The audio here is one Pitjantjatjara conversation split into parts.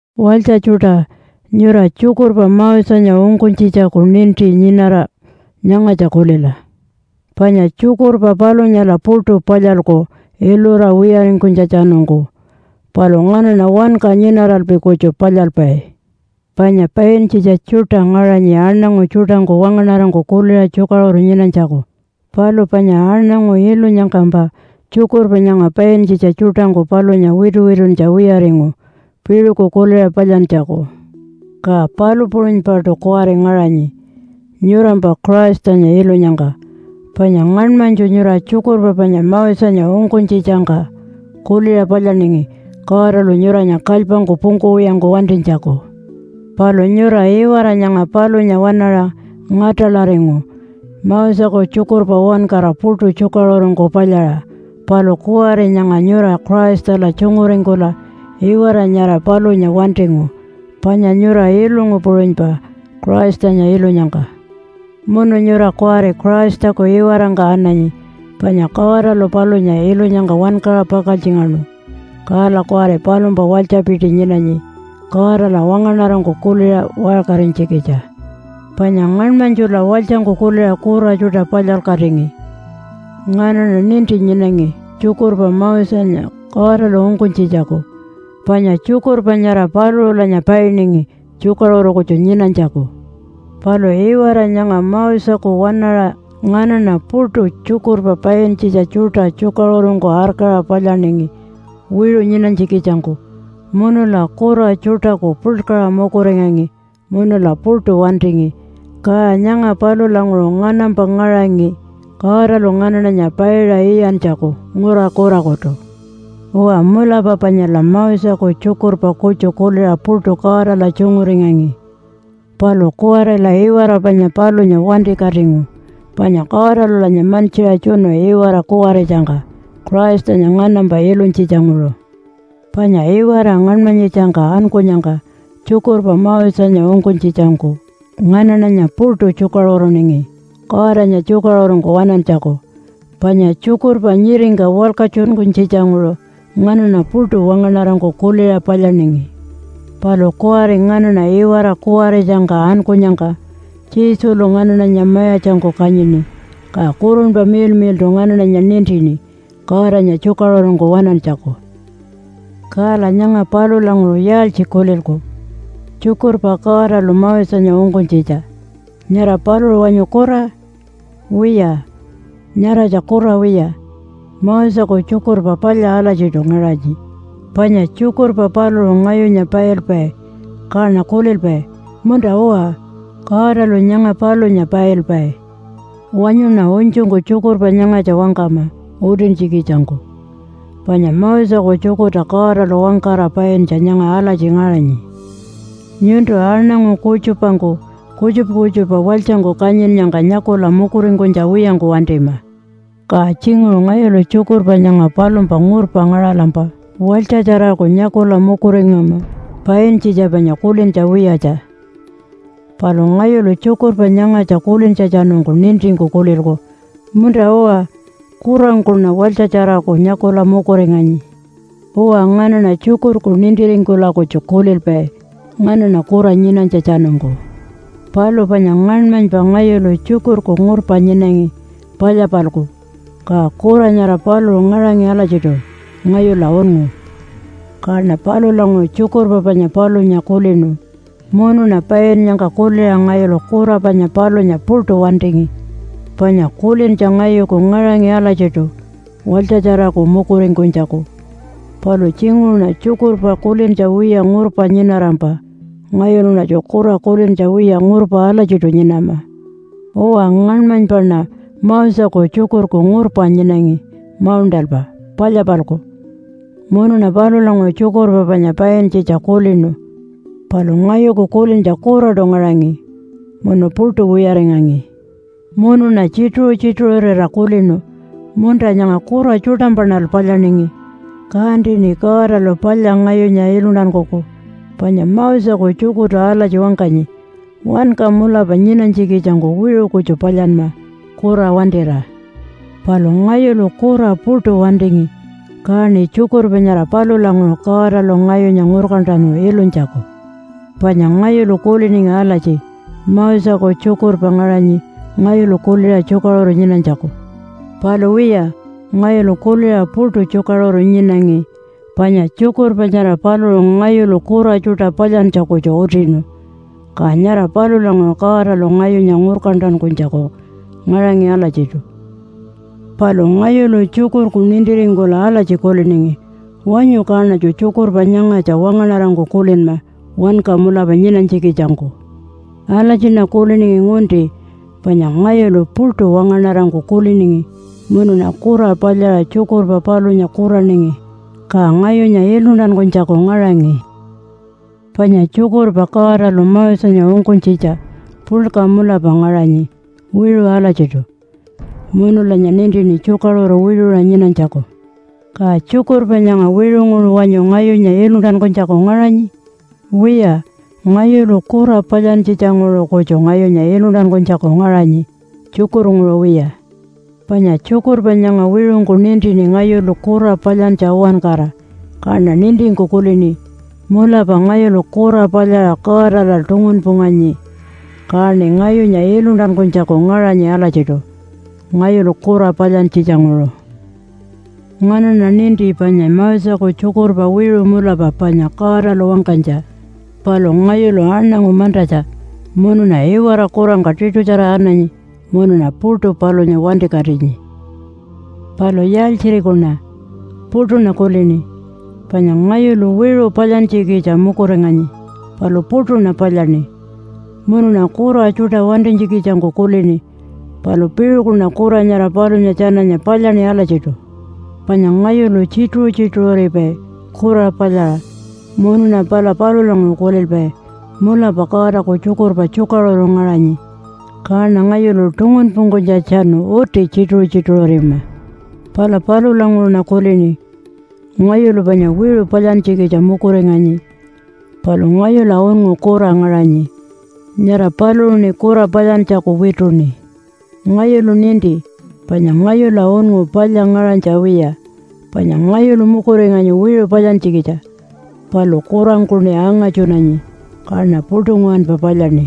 Walytja tjuṯa! Nyura tjukurpa Mosenya ungkunytjitjaku ninti nyinara nyangatja kulila, panya tjukurpa palunyala puṯu palyalku ilura wiyaringkunytjatjanungku, palu nganaṉa wanka nyinaralpi kutju palyalpai. Panya paintjitja tjuṯa ngaṟanyi aṉangu tjuṯangku wangaṉarangku kuliṟa tjukaṟuru nyinanytjaku. Palu panya aṉangu ilunyangkampa tjukurpa nyanga paintjitja tjuṯangku palunya wituwituntja wiyaringu piṟuku kuliṟa palyantjaku. Ka palu puṟunypaṯu kuwari ngaṟanyi nyurampa Christanya ilunyangka. Panya ngaṉmanytju nyura tjukurpa panya Mosenya ungkunytjitjangka kuliṟa palyaningi Godalu nyuranya kalypangku pungkuwiyangku wantinytjaku. Palu nyura iwara nyanga palunya waṉaṟa ngatalaringu Moseku tjukurpa uwankara puṯu tjukaṟurungku palyaṟa. Palu kuwari nyanga nyura Christala tjunguringkula iwara nyara palunya wantingu, panya nyura ilungu puṟunypa Christanya ilunyangka. Munu nyura kuwari Christaku iwarangka ananyi, panya Godalu palunya ilunyangka wankaṟa pakaltjingaṉu, kala kuwari palumpa walytjapiti nyinanyi Godala wangaṉarangku kuliṟa waṟkarinytjikitja. Panya ngaṉmanytjula walytjangku kuliṟa kura tjuṯa palyalkatingi. Nganaṉa ninti nyinangi tjukurpa Mosenya Godalu ungkunytjitjaku, panya tjukurpa nyara paluṟulanya painingi tjukaṟuru kutju nyinanytjaku. Palu iwara nyanga Moseku waṉaṟa nganaṉa puṯu tjukurpa paintjitja tjuṯa tjukaṟurungku arkaṟa palyaningi wiṟu nyinanytjikitjangku munula kura tjuṯaku puḻkaṟa mukuringangi munula puṯu wantingi. Ka nyanga palulanguṟu nganampa ngaṟangi Godalu nganaṉanya paiṟa iyantjaku ngura kurakutu. Uwa mulapa panyala Moseku tjukurpa kutju kuliṟa puṯu Godala tjunguringangi. Palu kuwarila iwara panya palunya wantikatingu panya Godalulanya mantjiṟa tjunu iwara kuwaritjangka Christanya nganampa ilunytjitjanguṟu. Panya iwara ngaṉmanyitjangka ankunyangka tjukurpa Mosenya ungkunytjitjangku nganaṉanya puṯu tjukaṟuruningi Godanya tjukaṟurungku waṉantjaku. Panya tjukurpa nyiringka walkatjunkunytjitjanguṟu nganaṉa puṯu wangaṉarangku kuliṟa palyaningi. Palu kuwari nganaṉa iwara kuwaritjangka ankunyangka Jesulu nganaṉanya mayatjangku kanyini, ka Kurunpa Miḻmiḻṯu nganaṉanya nintini Godanya tjukaṟurungku waṉantjaku. Kala nyanga palulanguṟu yaaltji kulilku tjukurpa Godalu Mosenya ungkunytjitja? Nyara paluṟu wanyu kura? Wiya, nyaratja kura wiya. Moseku tjukurpa palya alatjiṯu ngaṟanyi, panya tjukurpa paluṟu ngayunya pailpai kaṉa kulilpai, “Munta-uwa, Godalu nyanga palunya pailpai.” Wanyuṉa unytjungku tjukurpa nyangatja wangkama utintjikitjangku. Panya Moseku tjukurta Godalu wangkara paintja nyanga alatji ngaṟanyi, “Nyuntu aṉangu kutjupangku kutjupa kutjupa walytjangku kanyinnyangka nyakula mukuringkunytja wiyangku wantima!” Ka tjinguṟu ngayulu tjukurpa nyanga palumpa ngurpa ngaṟalampa walytjatjaraku nyakula mukuringama, paintjitja panya kulintja wiyatja. Palu ngayulu tjukurpa nyangatja kulintjatjanungku nintingku kulilku, “Munta-uwa, kurangkuṉa walytjatjaraku nyakula mukuringanyi.” Uwa, nganaṉa tjukurku nintiringkula kutju kulilpai nganaṉa kura nyinanytjatjanungku. Palu panya ngaṉmanypa ngayulu tjukurku ngurpa nyinangi palya-palku, ka kura nyara paluṟu ngaṟangi alatjiṯu ngayula unngu. Kaṉa palulanguṟu tjukurpa panya palunya kulinu, munuṉa painnyangka kuliṟa ngayulu kura panya palunya puṯu wantingi, panya kulintja ngayuku ngaṟangi alatjiṯu walytjatjaraku mukuringkunytjaku. Palu tjinguṟuṉa tjukurpa kulintja wiya ngurpa nyinarampa ngayuluṉatju kura kulintja wiya ngurpa alatjiṯu nyinama. Uwa, ngaṉmanypaṉa Moseku tjukurku ngurpa nyinangi mauṉṯalpa palya-palku. Munuṉa palulanguṟu tjukurpa panya paintjitja kulinu, palu ngayuku kulintja kuraṯu ngaṟangi munu puṯu wiyaringangi. Munuṉa tjituṟu-tjituṟurira kulinu, “Munta nyanga kura tjuṯampaṉal palyaningi. Kantiṉi Godalu palya ngayunya iluntankuku.” Panya Moseku tjukurtu alatji wangkanyi, “Wanka mulapa nyinanytjikitjangku wiṟu kutju palyanma, kura wantira.” Palu ngayulu kura puṯu wantingi kaṉi tjukurpa nyara palulanguṟu Godalu ngayunya ngurkantanu ilunytjaku. Panya ngayulu kuliningi alatji, “Moseku tjukurpa ngaṟanyi ngayulu kuliṟa tjukaṟuru nyinanytjaku.” Palu wiya, ngayulu kuliṟa puṯu tjukaṟuru nyinangi, panya tjukurpa nyara paluṟu ngayulu kura tjuṯa palyantja kutju utinu, ka nyara palulanguṟu Godalu ngayunya ngurkantankunytjaku ngaṟangi alatjiṯu. Palu ngayulu tjukurku nintiringkula alatji kuliningi, “Wanyu kaṉatju tjukurpa nyangatja wangaṉarangku kulinma wanka mulapa nyinanytjikitjangku.” Alatjiṉa kuliningi ngunti panya ngayulu puṯu wangaṉarangku kuliningi munuṉa kura palyaṟa tjukurpa palunya kuraningi, ka ngayunya iluntankunytjaku ngaṟangi. Panya tjukurpa Godalu Mosenya ungkunytjitja puḻka mulapa ngaṟanyi wiṟu alatjiṯu, munulanya nintini tjukaṟuru wiṟuṟa nyinanytjaku. Ka tjukurpa nyanga wiṟunguṟu wanyu ngayunya iluntankunytjaku ngaṟanyi? Wiya, ngayulu kura palyantjitjanguṟu kutju ngayunya iluntankunytjaku ngaṟanyi, tjukurnguṟu wiya. Panya tjukurpa nyanga wiṟungku nintini ngayulu kura palyantja uwankara, kaṉa nintingku kulini, “Mulapa ngayulu kura palyaṟa Godala tungunpunganyi, kaṉi ngayunya iluntankunytjaku ngaṟanyi alatjiṯu ngayulu kura palyantjitjanguṟu.” Nganaṉa ninti panya Moseku tjukurpa wiṟu mulapa panya Godalu wangkanytja. Palu ngayulu aṉangu mantatja munuṉa iwara kurangka tiṯutjara ananyi munuṉa puṯu palunya wantikatinyi. Palu yaaltjirikuṉa? Puṯuṉa kulini, panya ngayulu wiṟu palyantjikitja mukuringanyi, palu puṯuṉa palyaṉi. Munuṉa kura tjuṯa wantinytjikitjangku kulini, palu piṟukuṉa kura nyara palunya tjananya palyaṉi alatjiṯu. Panya ngayulu tjituṟu-tjituṟuripai kura palyaṟa munuṉa pala palulanguṟu kulilpai, “Mulapa Godaku tjukurpa tjukaṟuru ngaṟanyi, kaṉa ngayulu tungunpungkunytjatjanu uti tjituṟu-tjituṟurima.” Palulanguṟuṉa kulini, “Ngayulu panya wiṟu palyantjikitja mukuringanyi, palu ngayula unngu kura ngaṟanyi, nyara paluṟuṉi kura palyantjaku wituṉi.” Ngayulu ninti panya ngayula unngu palya ngaṟanytja wiya. Panya ngayulu mukuringanyi wiṟu palyantjikitja, palu kurangkuṉi angatjunanyi, kaṉa puṯu nguwanpa palyaṉi.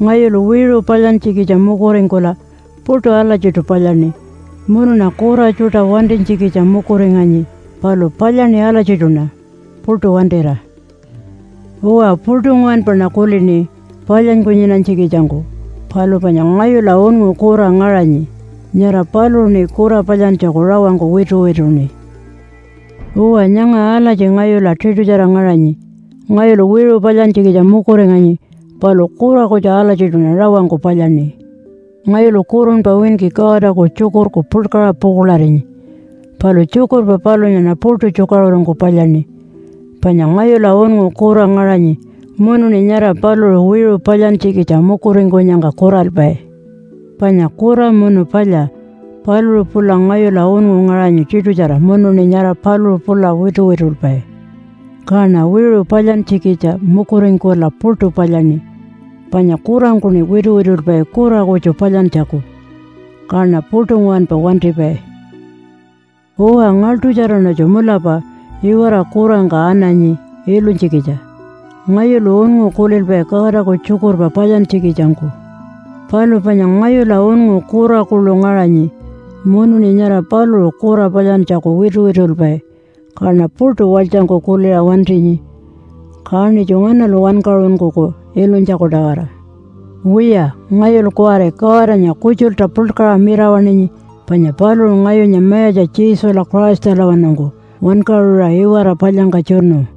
Ngayulu wiṟu palyantjikitja mukuringkula puṯu alatjiṯu palyaṉi, munuṉa kura tjuṯa wantinytjikitja mukuringanyi, palu palyaṉi alatjiṯuṉa puṯu wantira. Uwa, puṯu nguwanpaṉa kulini palyanyku nyinanytjikitjangku. Palu panya ngayula unngu kura ngaṟanyi, nyara paluṟuṉi kura palyantjaku rawangku wituwituṉi. Uwa, nyanga alatji ngayula tiṯutjara ngaṟanyi. Ngayulu wiṟu palyantjikitja mukuringanyi, palu kura kutju alatjiṯuṉa rawangku palyaṉi. Ngayulu kurunpa winki Godaku tjukurku puḻkaṟa pukuḻarinyi. Palu tjukurpa palunyaṉa puṯu tjukaṟurungku palyaṉi. Panya ngayula unngu kura ngaṟanyi munuṉi nyara paluṟu wiṟu palyantjikitja mukuringkunyangka kuralpai. Panya kura munu palya, paluṟu pula ngayula unngu ngaṟanyi tiṯutjara munuṉi nyara paluṟu pula wituwitulpai, kaṉa wiṟu palyantjikitja mukuringkula puṯu palyaṉi, panya kurangkuṉi wituwitulpai kura kutju palyantjaku. Kaṉa puṯu nguwanpa wantipai. Uwa, ngaḻṯutjaraṉatju mulapa iwara kurangka ananyi ilunytjikitja. Ngayulu unngu kulilpai Godaku tjukurpa palyantjikitjangku. Palu panya ngayula unngu kura kuḻu ngaṟanyi, munuṉi nyara paluṟu kura palyantjaku wituwitulpai, kaṉa puṯu walytjangku kuliṟa wantinyi. Kaṉitju nganalu wankaṟunkuku ilunytjaku-tawara? Wiya ngayulu kuwari Godanya kutjulta puḻkaṟa mirawaṉinyi, panya paluṟu ngayunya Mayatja Jesula Christalawanungku wankaṟuṟa iwara palyangka tjunu.